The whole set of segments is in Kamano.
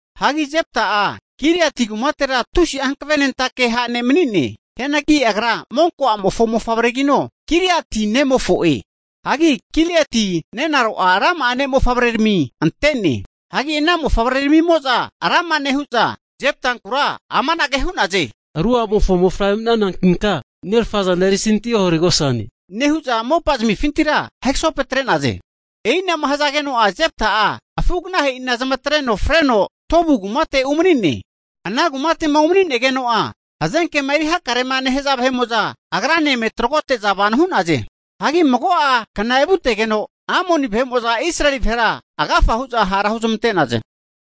Hagi Jepta'a Giliati kumatera tusi'a hankavenentake ha' ne' mani'ne. Hianagi agra monko a'mofo mofavregino Giliati nemofo'e. Hagi Gilieti nenaro'a rama'a ne' mofavrerami ante'ne. Hagi ana mofavreramimo'za rama nehu'za, Jeptankura amanage hu'naze, ru a'mofo mofavre mani'nanankinka nerafa zana erisanti oharegosane, nehu'za mopazmifintira ahegasopetre'naze. E'inama hazageno'a Jepta'a afu'aganahe'ina nezamatreno, freno Tobu kumate umani'ne. Ana kumate'ma unemanigeno'a hazenkema eri hakarema nehaza vahe'mo'za agrane eme tragote'za vano hu'naze. Hagi mago'a kna evutegeno Amoni vahe'mo'za Israeli vahera agafa hu'za hara huzmante'naze.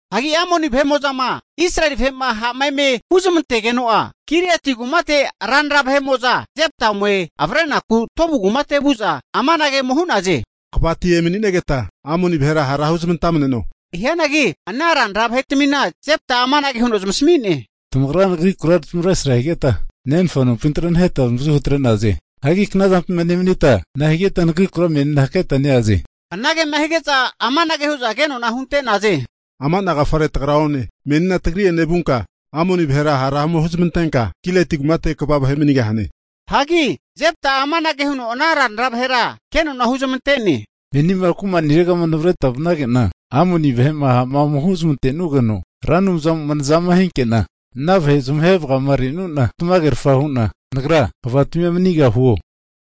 Hagi Amoni vahe'mo'zama Israeli vahe'ma ha'ma eme huzamantageno'a Giliati kumate ranra vahe'mo'za Jepta ome avrenaku Tobu kumate vu'za amanage ome hu'naze, kvati emani'negeta Amoni vahera hara huzamantamneno. Hianagi ana ranra vahetmina Jepta'a amanage huno zamasami'ne, Tamagra nagrikura tamavresra higeta nenfa nompintira naheta navazuhu atre'naze. Hagi knazampima nemanita nahigeta nagrikura menina haketa neaze? Anagema hige'za amanage hu'za kenona hunte'naze, Ama'na agafare tagra one. Menina tagri'ene vunka Amoni vahera hara ome huzamantenka Giliati kumate kva manigahane. Hagi Jepta'a amanage huno ana ranra vahera kenona huzamante'ne, Menima kumaniregama navreta vanage'na Amoni vahe'ma ha'ma ome huzamante'nugeno, Ra Anumzamo'ma nazama hinke'na, ana vahe'ma zamahe vagamarenu'na, tamagerfa hu'na nagra kvatimia manigahuo?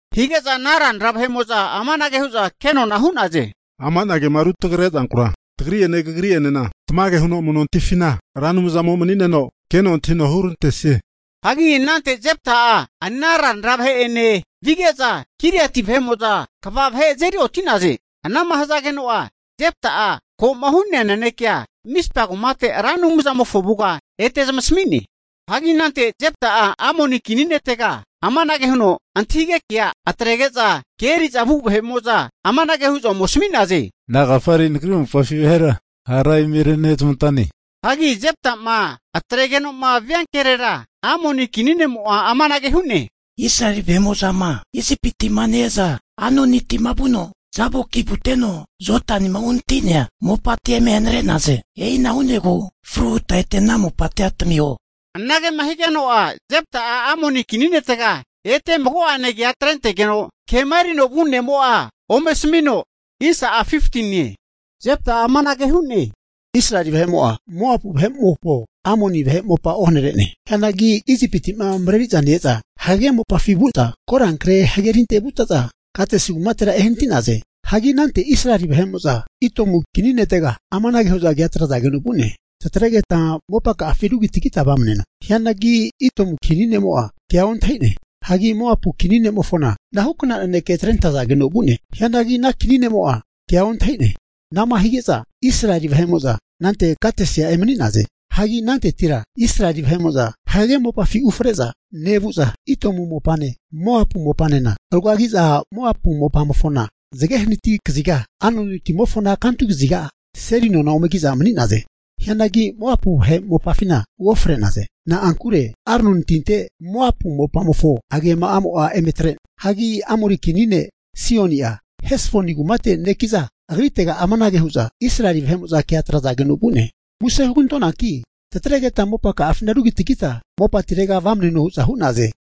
Hige'za ana ranra vahe'mo'za amanage hu'za kenona hu'naze, ama'na kema rutrage zankura tagri'ene kagri'enena tamage huno amu'notifina Ra Anumzamo mani'neno keno antahino hurantesie. Hagi anante Jepta'a ana ranra vahe'ene vige'za Giliati vahe'mo'za kva azeri oti'naze. Anama hazageno'a Jepta'a ko'ma hu'nea nanekea Mispa kumate Ra Anumzamofo avuga ete mago'ene zamasami'ne. Hagi anante Jepta'a Amoni kini ne'mofontega amanage huno antahige kea atrentege'za, ke eri'za vu vahe'mo'za amanage hu'za ome asami'naze, Nagafare nagri mopafi vahera hara eme renezmantane? Hagi Jeptama atregenoma viankerera Amoni kini ne'mo'a amanage hu'ne, Israeli vahe'mo'zama Isipiti'ma ne-eza Arnonitima vuno Jaboki vuteno Jodanima uhanati'nea mopatia eme hanare'naze. E'ina hu'negu fruhuta ete ana mopatia tamiho. Anagema higeno'a Jepta'a Amoni kini netega ete mago'ane kea atregeno kema erino vu' ne'mo'a ome asamino, Jepta'a amanage hu'ne, Israeli vahe'mo'a Moapu vahe mopane, Amoni vahe mopa kumazafa osene. Hianagi Isipiti'ma mareri'za ne-eza hagage mopafi vu'za korankre hagerinte vute'za, Kadesi kumatera ehanati'naze. Hagi anante Israeli vahe'mo'za Idomu kini netega amanage hu'za kea atrazageno vu'ne. Tatregeta mopaka'afi rugitagita vamaneno. Hianagi Idomu kini ne'mo'a kea ontahine. Hagi Moapu kini ne'mofona anahukna naneke atrentazageno vu'ne. Hianagi ana kini ne'mo'a kea ontahi'ne. Ana'ma hige'za Israeli vahe'mo'za anante Kadesia emani'naze. Hagi anantetira Israeli vahe'mo'za hagage mopafi ufre'za nevu'za Idomu mopane, Moapu mopanena rugagiza Moapu mopamofona zage hanati kaziga, Arnoni timofona kantu kaziga seli nona omeki'za mani'naze. Hianagi Moapu vahe mopafina uofre'naze. Na'ankure Arnoni tinte Moapu mopamofo atupamo'a eme atre'ne. Hagi Amori kini ne' Sihoni'a, Hesboni kumateti neki'za, agritega amanage hu'za Israeli vahe'mo'za kea atrazageno vu'ne. Muse hugantonanki tatregeta mopaka'afina rugitagita mopatirega vamneno hu'za hu'naze.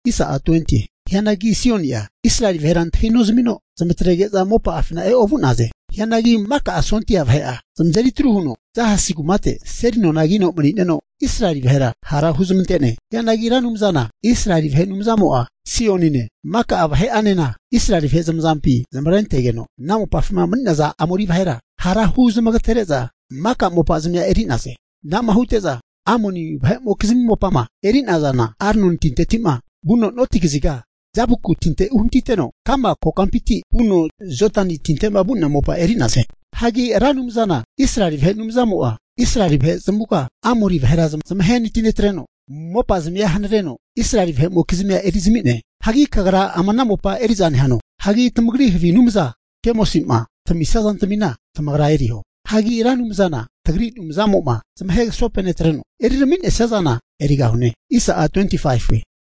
Hianagi Sihoni'a Israeli vahera antahinozamino zamatrege'za mopa'afina eovu'naze. Hianagi maka sondia vahe'a zamazeri atru huno Jahas kumate seli nona kino mani'neno, Israeli vahera hara huzamante'ne. Hianagi Ra Anumzana Israeli vahe Anumzamo'a Sihonine maka vahe'anena Israeli vahe zamazampi zmavrentegeno, ana mopafima mani'naza Amori vahera hara huzamagatere'za maka mopazamia eri'naze. Ana'ma hute'za Amoni vahe'mokizmi mopama eri'nazana, Arnoni tinteti'ma vuno noti kaziga Jaboku tinte uhanatiteno, ka'ma kokampinti vuno Jodani tinte'ma vu'nea mopa eri'naze. Hagi Ra Anumzana Israeli vahe Anumzamo'a Israeli vahe zamavuga Amori vahera zamahenati netreno mopazami hanareno Israeli vahe'mokizmi erizami'ne. Hagi kagra ama ana mopa eri'za nehano? Hagi tamagri havi anumza Kemosi'ma tamisia zantamina tamagra eriho. Hagi Ra Anumzana tagri Anumzamo'ma zamahe kasopenetreno erirami'nesia zana erigahune.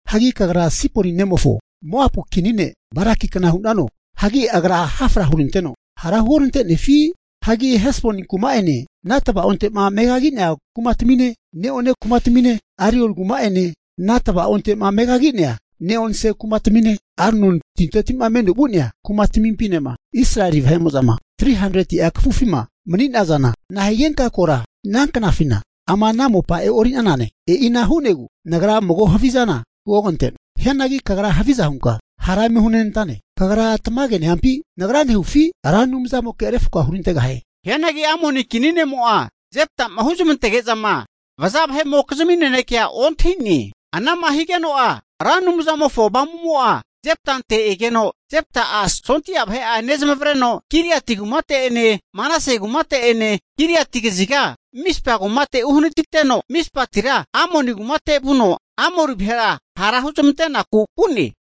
Hagi kagra Sipori nemofo, Moapu kini ne' Baraki kna hunano? Hagi agra hafra huoranteno, hara huorantenefi? Hagi Hesboni kuma'ene ana tava'onte'ma megagi'nea ne'one kumatamine, Aroel kuma'ene, ana tava'onte'ma megagi'nea neonse kumatamine, Arnoni tinte'ma meno vu'nea kumatamimpinema Israeli vahe'mo'zama 300'a kafufima mani'nazana, nahigenka kora ana knafina ama ana mopa e'ori'nanane? E'ina hu'negu nagra mago havizana huogante'noe. Hianagi kagra haviza hunka hara eme hunenantane. Kagra tamage nehampi, nagra nehufi Ra Anumzamoke refko'a hurantegahie. Hianagi Amoni kini ne'mo'a Jepta'ma huzmantege'zama vaza vahe'mokizmi nanekea ontahi'ne. Ana'ma higeno'a Ra Anumzamofo Avamu'mo'a Jeptante egeno Jepta'a sondia vahe'a nezmavreno Giliati mopafine Manase mopafine Giliati kaziga Mispa kumate uhanatiteno, Mispatira Amoni kumate vuno Amoni vahera hara huzmante'naku vu'ne.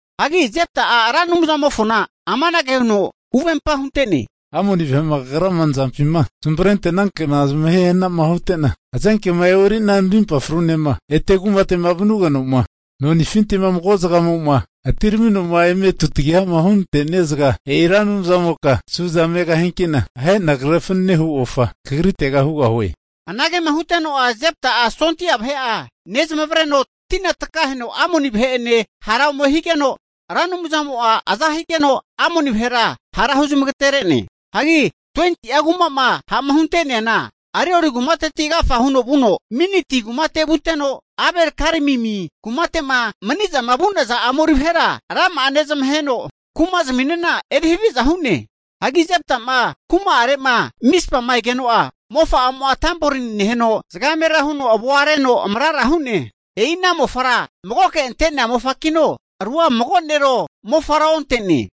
Hagi Jepta'a Ra Anumzamofona amanage huno huvempa hunte'ne, Amoni vahe'ma kagrama nazampima zamavarente'nanke'na zamahe hnama hute'na, hazenkema e'ori'na narimpa frunema ete kumate'ma vanugeno'ma nonifinti'ma mago zagamo'ma ese'ma atiramino'ma eme tutagihama hunante'nia zaga, e'i Ra Anumzamoka suza megahianki'na, ahe'na kre fanane hu ofa kagritega hugahue. Anagema huteno'a Jepta'a sondia vahe'a nezmavreno tina takaheno Amoni vahe'ene hara ome higeno, Ra Anumzamo'a aza higeno Amoni vahera hara huzamagatere'ne. Hagi 20'a kuma'ma ha'ma hunte'neana, Aroeri kumateti agafa huno vuno Miniti kumate vuteno, Abel-keramimi kumate'ma mani'zama vu'naza Amori vahera rama'a nezamaheno kuma'ziminena erihaviza hu'ne. Hagi Jepta'ma kuma'are'ma Mispama egeno'a, mofa'amo'a tamborini neheno zagamera huno avoa reno amarara hu'ne. E'ina mofara magoke ante'nea mofakino, rua mago nero mofaro onte'ne.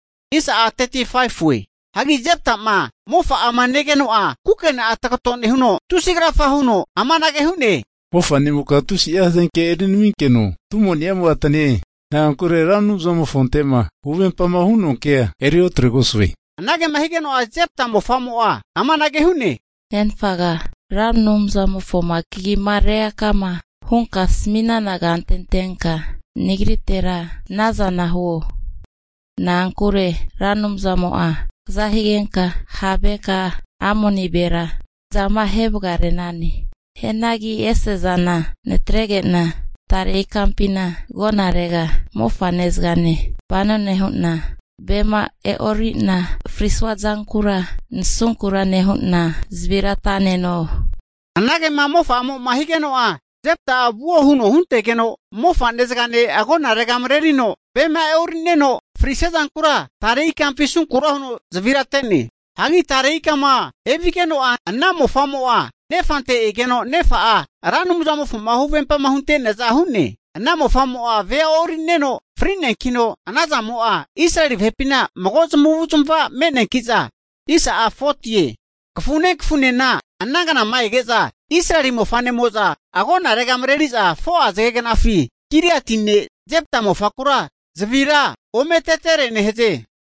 Hagi Jepta'ma mofa'ama negeno'a kukena'a tagato nehuno, tusi krafa huno amanage hu'ne, Mofanimoka tusi'a hazenke erinaminkeno tumonimo'a atane. Na'ankure Ra Anumzamofonte'ma huvempama hu'noa kea eriotregosue. Anagema higeno'a Jepta mofamo'a amanage hu'ne, Nenfaga, Ra Anumzamofoma kagi'ma reakama hunka asami'nana kante antenka nagritera anazana huo. Na'ankure Ra Anumzamo'a kaza higenka ha' vaheka'a Amoni vahera zamahe vagare'nane. Hianagi ese'zana natrege'na tare ikampina agonarega mofane zagane vano nehu'na, vema e'ori'na frisua zankura nasunkura nehu'na zavira ata'neno. Anagema mofa'amo'ma higeno'a Jepta'a vuo huno huntegeno, mofane zagane agonarega marerino vema e'ori'neno frisia zankura tare ikampi asunkura huno zavira ate'ne. Hagi tare ikama evigeno'a ana mofamo'a nefante egeno nefa'a Ra Anumzamofoma huvempa hunte'neaza hu'ne. Ana mofamo'a vea e'ori'neno fri'neankino anazamo'a, Israeli vahepina mago zamavu'zamava me'neanki'za, kafune kafunena ana knama ege'za Israeli mofa'nemo'za agonarega mareri'za 4'a zagegnafi Giliati ne' Jepta mofakura zavira ometetere nehaze.